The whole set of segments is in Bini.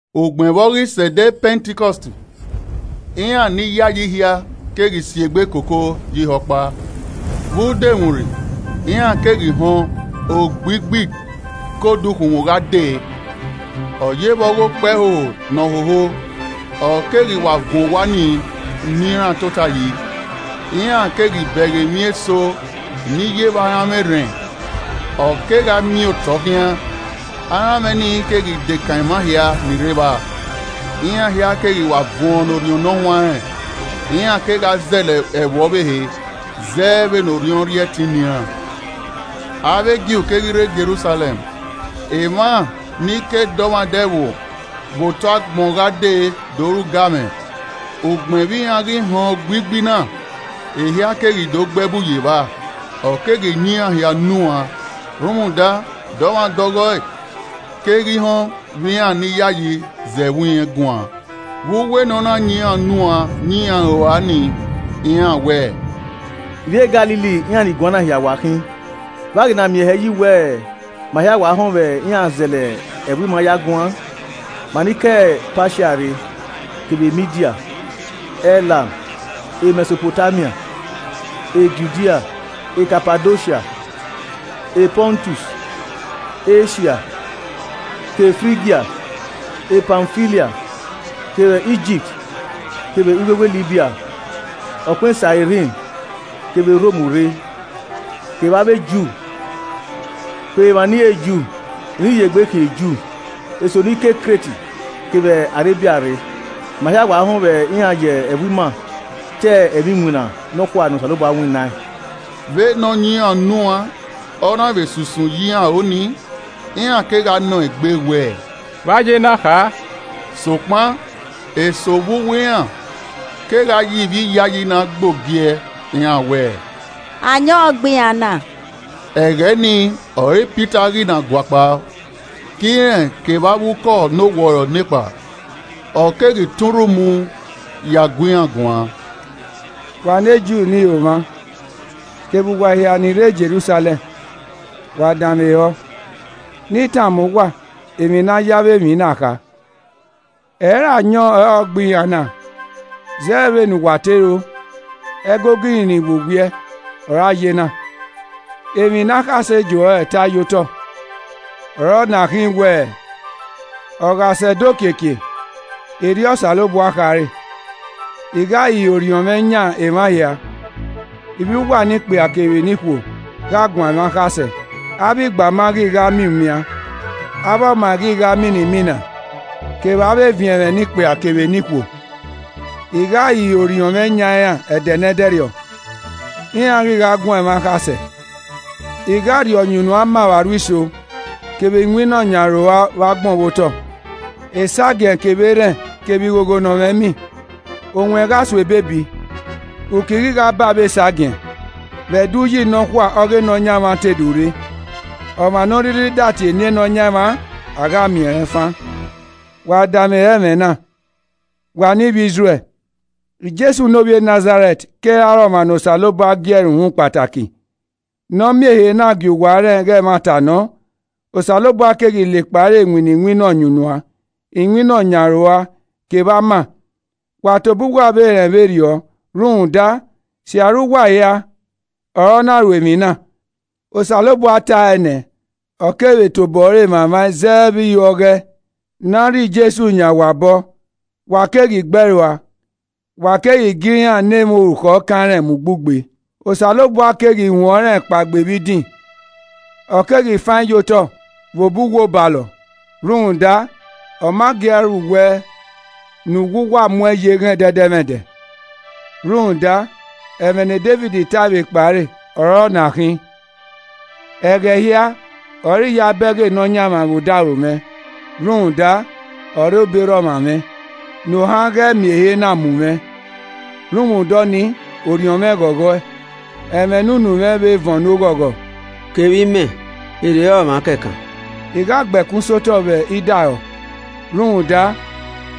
Ugbẹn vbe ọ ghi sẹ ẹdẹ Pẹntikọst, iran ni yayi hia keghi si egbe koko ye ihe ọkpa. Vbe udomwurri, iran keghi họn ogbigbi ke odukhunmwu gha dee, ọ yevbe ọghe okpẹhoho ne ọ hoho, ọ keghi wa vuọn owa nii ne iran tota yi. Iran keghi bẹghe emwi eso ni ye vbe aranmwẹ erhẹn, ọ kegha miẹn otọ khian, aranmwẹ nii keghi dekan emwa hia ni rre evba. Iran hia keghi wa vuọn ne Orhiọn Ne Ọ Huanrẹn, iran kegha zẹlẹ ẹvbo ọvbehe, zẹ vbene Orhiọn rhie ẹtin ne iran. Avbe Ju keghi rre Jerusalẹm, emwa ni ke dọmwadẹ ẹvbo vbe otọ agbọn gha dee do ru ugamwẹ. Ugbẹn vbe iran ghi họn ogbigbi na, ehia keghi do gbe ẹbu ye evba, ọ keghi yan iran hia unu uan, rhunmwuda dọmwadẹ ọghọe keghi họn vbe iran ni yayi zẹ ẹvbo irẹn guan. Vbe uwu ne ọna yan iran unu uan yan iran aro ua nii, iran wẹẹ, “Ivbi e Galili iran ni guan na hia khin. Vbe a ghi na miẹn hẹ yi wẹ, ma hia wa họn vbe iran zẹlẹ ẹvbo ima ya guan? Ma ni ke Patia rre kevbe Midia, Ẹlam, Mẹsopotamia, Judia, Kapadosia, Pọntus, Esia, Ke Frigia Pamfilia, kevbe Igipt kevbe iwewe Libya, ọkpẹn Sairin kevbe Rom rre. Kevbe avbe Ju, kevbe emwa ne ẹ i re Ju ni ghi ye egbe khian Ju, eso ni ke Kret kevbe Arebia rre. Ma. hia wa họn vbe iran ye ẹvbo ima ta ẹmwẹ iwinna nọkhua ne Osanobua winnaẹn.” Vbene ọ yan iran unu uan, ọ na vbe sunsun ye iran aro nii, iran kegha nọ egbe wẹẹ, “Vbe a ya ena kha?” Sokpan, eso vbe uwu iran kegha ye ivbi iyayi na gbe ogie iran wẹẹ, “Ayọn ọre ọ gbe iran na!” Ẹghẹ ni ọre Pita ghi na guakpao, ke irẹn kevbe avbe Ukọ ne owọrọ nekpa, ọ keghi tọn urhu mu ya gu iran guan: “Wa ne Ju ne ihomwa, kevbe uwa hia ni rre Jerusalẹm, wa danmwehọ, ne I tama uwa emwi ne a ya avbe emwi na kha. Ẹ i re ayọn ọre ọ gbe iran na, zẹ vbene uwa te ro, ẹgogo ihinrin vbe owiẹ ọre a ye na. Emwi ne akhasẹ Joẹl ta ye otọ ọre ọna khin wẹẹ, “ ‘Ọ gha sẹ ẹdẹ okiekie, erriọ Osanobua khare: I gha hihiẹ Orhiọn mwẹ yan emwa hia. Ivbi uwa ne ikpia kevbe ne ikhuo gha guan ẹmwẹ akhasẹ avbe igbama ghi gha miẹn umian, avbe ọmaẹn ghi gha mian imina. Kevbe avbe eviẹn mwẹ, ne ikpia kevbe ne ikhuo, I gha hihiẹ Orhiọn mwẹ yan iran ẹdẹ nẹdẹrriọ iran ghi gha guan ẹmwẹ akhasẹ. I gha rhie ọyunnuan ma vbe aro iso, kevbe iwinna ọyanaroua vbe agbọn vbe ototọ. Esagiẹn kevbe erhẹn kevbe ighogho nọ mwẹ imi. Owẹn gha so ebiebi, uki ghi gha baa vbe esagiẹn, vbe Ẹdẹ uyi nọkhua ọghe Nọyaẹnmwa te do rre. Ọmwa ne ọ rhirhi da tie eni Nọyaẹnmwa, a gha miẹn rẹn fan.’ “Wa danmwehọ ẹmwẹ na, wa ne ivbi Izrẹl. Jesu ne ovbi Nazarẹt keghi re ọmwa ne Osanobua gie ẹre uhunmwu kpataki, ne ọ miẹn ehe na gie uwa rẹn ighe ẹmwata nọ, Osanobua keghi la ekpa ẹre winna iwinna ọyunnuan, iwinna ọ yan aro ua kevbe ama, wa tobọ uwa vbe rẹn vberriọ, rhunmwuda, sirra uwa hia ọre a na ru emwi na. Osanobua tae nẹ, ọ kevbe tobọ ẹre mwamwaẹn zẹ vbe iho ọghọe, ne a rhie Jesu yan uwa obọ. Wa keghi gbe ẹe rua, wa keghi gie iran ne emwa orukhọ kan rẹn mu ugbugbe. Osanobua keghi huẹn ọnrẹn kpaegbe vbe idin, ọ keghi faẹn ye otọ Vbe obọ uwu obalọ, rhunmwuda ọ ma gia ru wẹ ne uwu wu muẹn ye eghan ẹdẹdẹmwẹdẹ. Rhunmwuda, ẹmwẹ ne Devid tae vbe ekpa ẹre ọre ọna khin: “ ‘Ẹghẹ hia ọre I ya bẹghe Nọyaẹnmwa vbe odaro mwẹ, rhunmwuda, ọ rre obọ erha ọmwa mwẹ, ne ohan ghẹ miẹn ehe na mu mwẹ. Rhunmwuda ọnii, orhiọn mwẹ ghọghọe, ẹmwẹ ne unu mwẹ vbe vuọn ne oghọghọ, kevbe imẹ, I rhe re ọmwa kẹkan, I gha gbe ẹkun sẹ otọ vbe idaehọ. Rhunmwuda,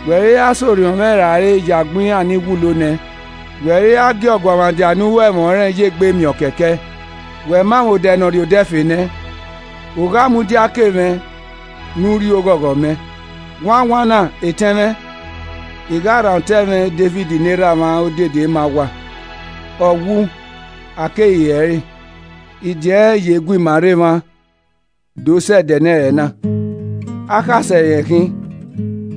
wẹ i ra sẹ orhiọn mwẹ rae, ye agbọn iran ni wulo nẹ. Wẹ i ra gie ọguọmwadia ne ọ ho ẹmwẹ ruẹn, ye egbe miẹn ọ kẹkẹe. Wẹ ma mwẹ odẹ ne ọ rrie odẹ ẹfe nẹ, u gha mudia ke mwẹ, ne u rhie oghọghọ mẹ.’ “Wanwanna etẹn mwẹ, I gha rhan otọ ẹmwẹ Devid ne erhamwa odede ma uwa. Ọ wu, a keghi re ẹre. Idin ẹnrẹn ye gu ima rre emwa do sẹ ẹdẹ ne ẹre na. Akhasẹ rẹn khin,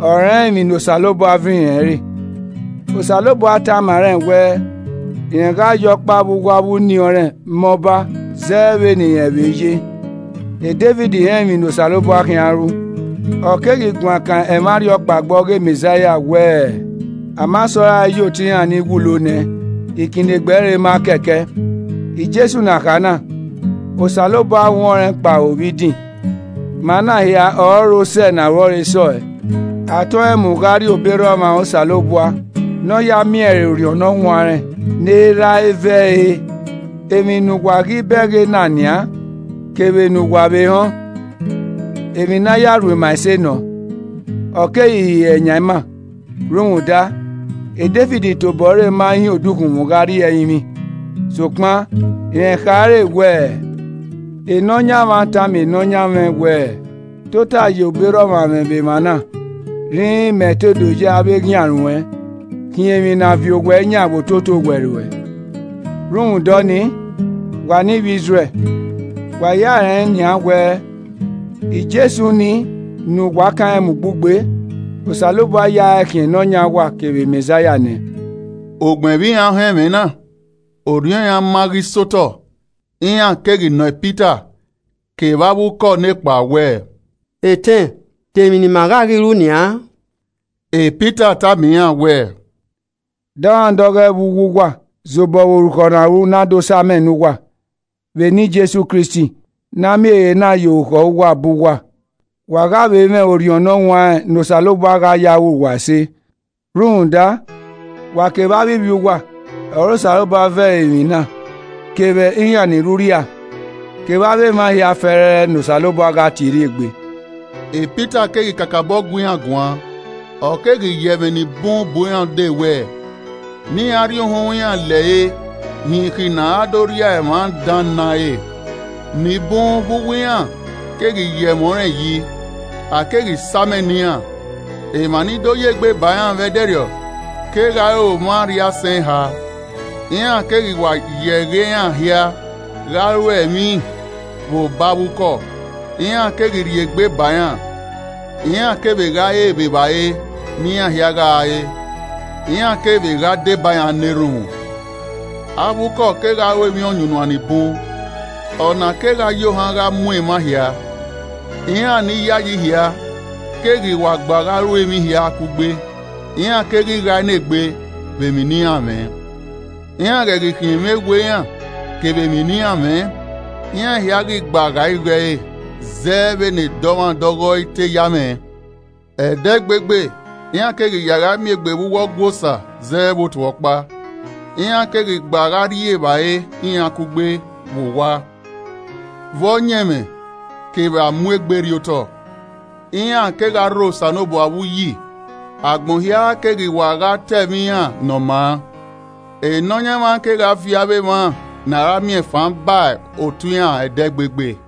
ọ rẹn emwi ne Osanobua ve irẹn re. Osanobua tama rẹn wẹ, rẹn gha ya ọkpa vbe uwu avbe uniẹn ọnrẹn ma ọba, zẹ vbene irẹn vbe ye. Devid rẹn emwi ne Osanobua khian ru, ọ keghi guan kan ẹmwẹ arhiọkpaegbe ọghe Mẹzaia wẹẹ: “ ‘A ma sẹ ọe rae ye otọe iran ni wulo nẹ, ikinnegbe ẹre ma kẹkẹ.’ “Jesu ne a kha na, Osanobua huẹn ọnrẹn kpao vbe idin, ma na hia ọre osẹe ne aro ẹre sẹ ọe. A tọẹn mu gha rrie obọ erha ọmwa Osanobua, ne ọ ya miẹn ẹre Orhiọn Ne Ọ Huanrẹn ne Erha ẹe ve ẹre. Emwi ne uwa ghi bẹghe na nian, kevbe ne uwa vbe họn, emwi ne ọ ya ru ima ẹse nọ, ọ keghi hihiẹe yan ima. Rhunmwuda, Devid tobọ ẹre ma hin odukhunmwu gha rrie ẹrinmwi, sokpan rẹn khare wẹẹ, “ ‘Nọyaẹnmwa tama Nọyaẹnmwẹ wẹẹ, Tota ye obọ erha ọmwa mwẹ vbe emwa na, rhinrin mẹ te do ye avbe eghian ruẹn khian emwi ne a viọ owẹ yan vbe ototọ owẹ ruẹ.’ “Rhunmwuda ọnii, wa ne ivbi Izrẹl, wa hia rẹn nian wẹẹ, Jesu nii ne uwa kan mu ugbugbe, Osanobua ya ẹe khian Nọyaẹnmwa kevbe Mẹzaia nẹ.” Ugbẹn vbe iran họn ẹmwẹ na, orhiọn iran ma ghi sẹ otọ, iran keghi nọ Pita kevbe avbe ukọ nekpa wẹẹ, “Etẹn de emwi ne ima ghẹ ghi ru nian?” Pita tama iran wẹẹ, “Dọmwadẹ ọghọe vbe uwu uwa zẹ obọ vbe orukhọ ne a ru ne a do sa amẹ ne uwa, vbe eni Jesu Kristi, ne a miẹn ehe na ya orukhọ uwa bọ uwa, wa gha vbe mwẹ Orhiọn Ne Ọ Huanrẹn ne Osanobua gha ya ru uwa ẹse. Rhunmwuda, wa kevbe avbe ivbi uwa ọre Osanobua ve ẹre emwi na kevbe iran ni rre urria, kevbe avbe emwa hia fẹẹrẹ ne Osanobua gha tie rrie egbe.” Pita keghi kakabọ gu iran guan, ọ keghi ya ẹmwẹ ni bun bu iran ude wẹẹ, ne iran rhie uhunmwu iran lẹre hin ikhi ne a ra do rria emwa dan na re. Ni bun vbe uwu iran keghi ya ẹmwẹ ọnrẹn yi, a keghi sa amẹ ne iran, emwa ni do ya egbe ba iran vbe ẹdẹrriọ kegha re omwa arriaisẹn eha. Iran keghi wa ya ẹghẹ iran hia gha ruẹ emwi vbe obọ avbe ukọ, iran keghi rhie egbe ba iran. Iran kevbe gha re vbe evbare ne iran hia gha re, iran kevbe gha deba iran na erhunmwu. Avbe ukọ kegha ru emwi ọyunnuan ni bun, ọna kegha ya ohan gha mu emwa hia. Iran ni yayi hia keghi wa gba gha ru emwi hia kugbe, iran keghi ghae ne egbe vbe emwi ne iran mwẹ. Iran ghẹ ghi khiẹn emwi ewe iran, kevbe emwi ne iran mwẹ, iran hia ghi gba gha igho ẹre zẹ vbene edọmwadẹ ọghọe i te ya mwẹ. Ẹdẹgbegbe, iran keghi ya gha mi egbe vbe uwu Ọgua Osa zẹ vbe otu ọkpa. Iran keghi gba gha rri evbare iran kugbe vbe owa, vbe ọyẹnmwẹ kevbe amu egbe rriotọ. Iran kegha rho Osanobua vbe uyi, agbọn hia keghi wa gha ta ẹmwẹ iran ne ọ maa. Nọyaẹnmwa kegha viọ avbe emwa ne a ra miẹn fan ba otu iran ẹdẹgbegbe.